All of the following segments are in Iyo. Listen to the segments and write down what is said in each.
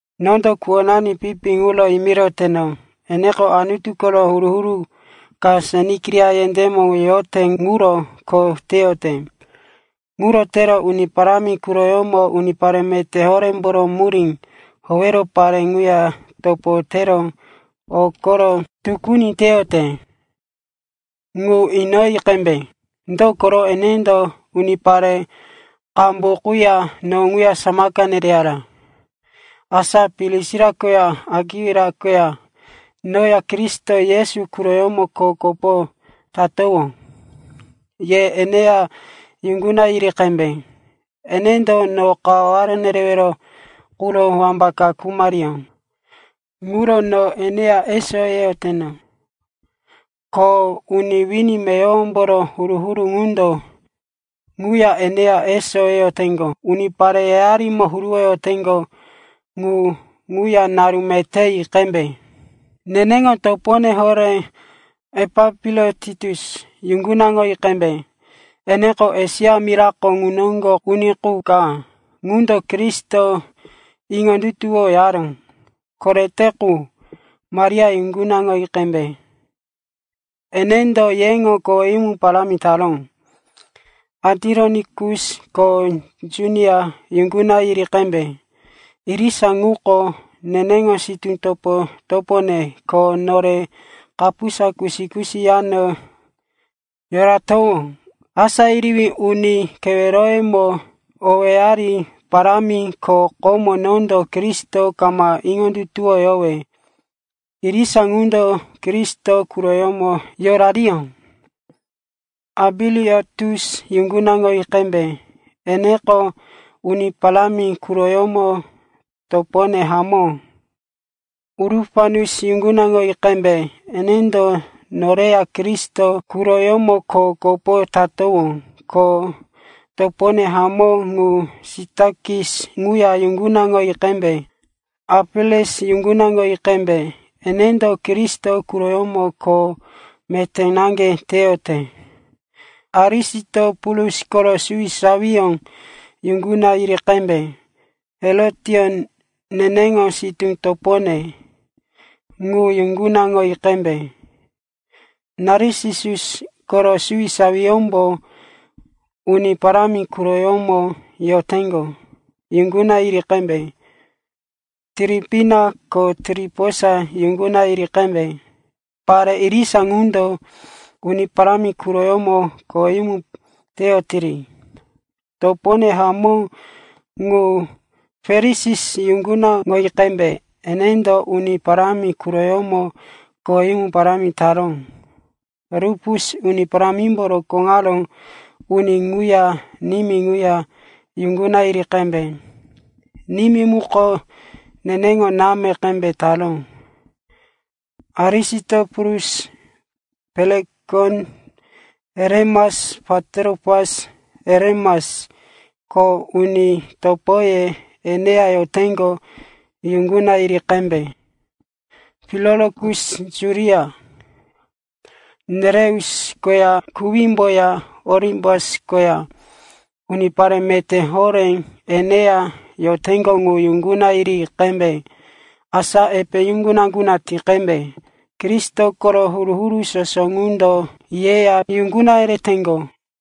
Nondo kuwonani Fipi ŋuro yimiroteno, eneko Anutu koro huru-huru ka Senkiria yendémo yote ŋuro kho teyote. Ŋuro tero Uni Parámi quroyómo unipare meté horémboro murí howero pare ŋuya topo tero o koro tukuni teyote ŋu inoyi qembe. Dokoro enendo unipare qambu quya no ŋuya samaka nereyara. Asa Prisila koya Akwila koya noya Kristo Yesu quroyómo kho kopo tatowó. Ye eneya yuŋguna yiri qembe. Enendo no kawaware nerewero quro wambaka khumariyó. Ŋuro no eneya eso yeyoteno, ko uni wini meyowomboro huru-huru ŋundo ŋuya eneya eso yeyoteŋgo. Unipare yayarimo huruwoyoteŋgo ŋu ŋuya naru meté yi qembe. Neneŋo topone horé Epainetus yuŋgunaŋoyi qembe. Eneko Esia mirako ŋu noŋgo uni qu ka ŋundo Kristo iŋondutuwoyaró korete qu. Maria yuŋgunaŋoyi qembe. Enendo yeŋo koweyumu parámi taró. Andironikus ko Junia yuŋguna yiri qembe. Irisa ŋuko neneŋo sitú topo-topone ko nore kapusa kusi-kusi yano yoratowó. Asá yerewí uni keweroyemo owéyari parámi, ko komo nondo Kristo kama iŋondutuwoyowe irisa ŋundo Kristo quroyómo yorariyó. Ambiliatus yuŋgunaŋoyi qembe. Eneko Uni Parámi quroyómo topone hamó. Urupanus yuŋgunaŋoyi qembe. Enendo noreya Kristo quroyómo kho kopo tatowó. Ko topone hamó ŋu Sitakis ŋuya yuŋgunaŋoyi qembe. Apeles yuŋgunaŋoyi qembe. Enendo Kristo quroyómo kho meté naŋge teyote. Arisitopulus koro suwisawiyó yuŋguna yiri qembe. Herotion, neneŋo sitú topone, ŋu yuŋgunaŋoyi qembe. Narsisus koro suwisawiyómbo Uni Parámi quroyómo yoteŋgo yuŋguna yiri qembe. Tiripina ko Tiriposa yuŋguna yiri qembe. Pare irisa ŋundo Uni Parámi quroyómo koweyumu teyotiri. Topone hamó ŋu Persis yuŋgunaŋoyi qembe. Enendo Uni Parámi quroyómo koweyumu parámi taró. Rupus, Uni Parámimbo rokóŋaró uni ŋuya nimí ŋuya yuŋguna yiri qembe. Nimí muko neneŋo náme qembe taró. Asinikiritus, Pelekon, Heremes, Patropas, Herimas ko uni topoye eneya yoteŋgo yuŋguna yiri qembe. Pilolokus, Julia, Nereus koya kuwímboya Olimbas koya unipare meté horé eneya yoteŋgo ŋu yuŋguna yiri qembe. Asa epe yuŋguna-yuŋguna ti qembe. Kristo koro huru-huru soso ŋundo yeya yuŋguna yereteŋgo.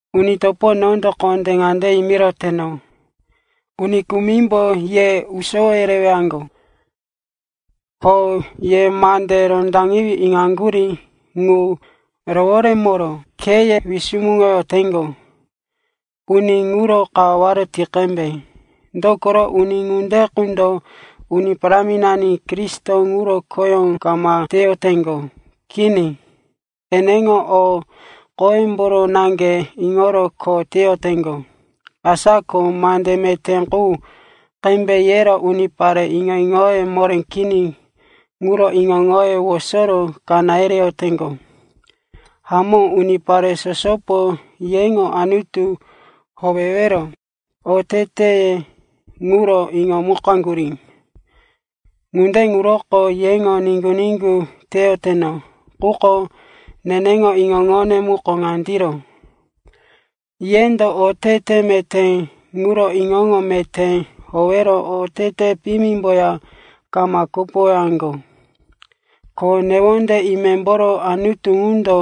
Uni topo, nondo kondé ŋande yimiroteno, uni kumimbo ye usowo yerewaŋgo, ko ye mande rondaqewí iŋaŋgurí ŋu roworemoro kheye wisumuŋoyoteŋgo. Uni ŋuro kawaware ti qembe. Dokoro uni ŋunde qundo Uni Paráminani Kristo ŋuro khoyó kama teyoteŋgo. Kini, eneŋo o qoyemboro naŋge iŋoro kho teyoteŋgo. Asa ko mande meté qu qembe yero unipare iŋo-iŋoye moré kini ŋuro iŋo-iŋoye wosoro kaná yereyoteŋgo. Hamó, unipare sosopo yeŋo Anutu howewero oteteye ŋuro iŋomukaŋgurí. Ŋunde ŋuroko yeŋo niŋgu-niŋgu teyoteno. Quko neneŋo iŋo-iŋone muko ŋandiro, yendo otete meté ŋuro iŋo-iŋo meté howero otete piyimimboya kama kopowaŋgo. Ko newonde imemboro Anutu ŋundo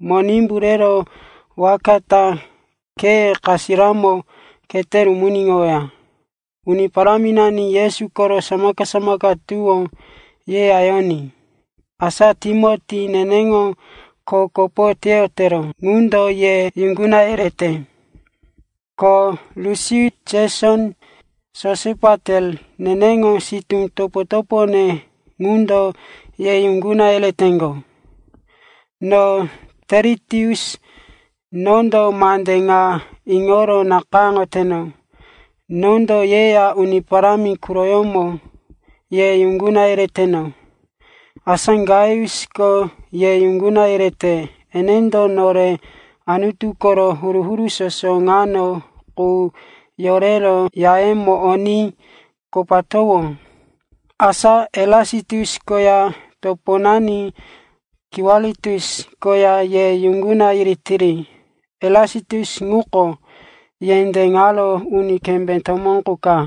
Monimbu rero waka ta kheye kasiramo khete rumuniŋoweya. Uni Paráminani Yesu koro samaka-samaka tuwó yeya yoní. Asa Timoti, neneŋo kho kopo teyotero ŋundo ye yuŋguna yerete. Ko Lusius, Jeson, Sosipater, neneŋo sitú topo-topone ŋundo ye yuŋguna yereteŋgo. No Teritius, nondo mande ŋa iŋoro nakayáŋoteno. Nondo yeya Uni Parámi quroyómo ye yuŋguna yereteno. Asa Gaiusko ye yuŋguna yerete. Enendo nore Anutu koro huru-huru soso ŋano qu yorero yayómo oní kopatowó. Asa Erasitus koya toponani Kwartus koya ye yuŋguna yiritiri. Erasitus ŋuko yendé ŋaro uni kembé tomó qu ka.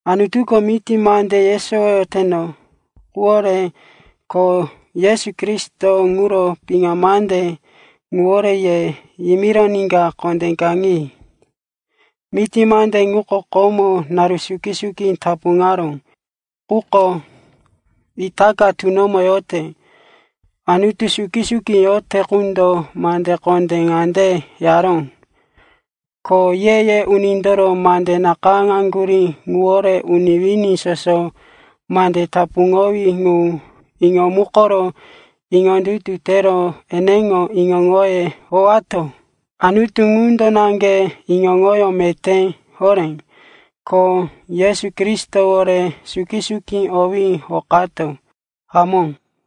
Anutuko miti mande yesowoyoteno quwore ko Yesu Kristo ŋuro piŋa mande ŋuwore ye yoriníka kondé kaŋi. Miti mande ŋuko komo naru suki-suki tapuŋaró, quko itaka tunomo yote. Anutu suki-suki yote qundo mande kondé ŋande yaró, ko ye-ye unindoro mande nakayáŋgurí ŋuwore uni wini soso mande tapuŋowí ŋu iŋomukoro iŋondutu tero eneŋo iŋo-iŋoyó howewato. Anutu ŋundo naŋge iŋo-iŋoyó meté horé, ko Yesu Kristowore suki-suki owí hokato. Hamó.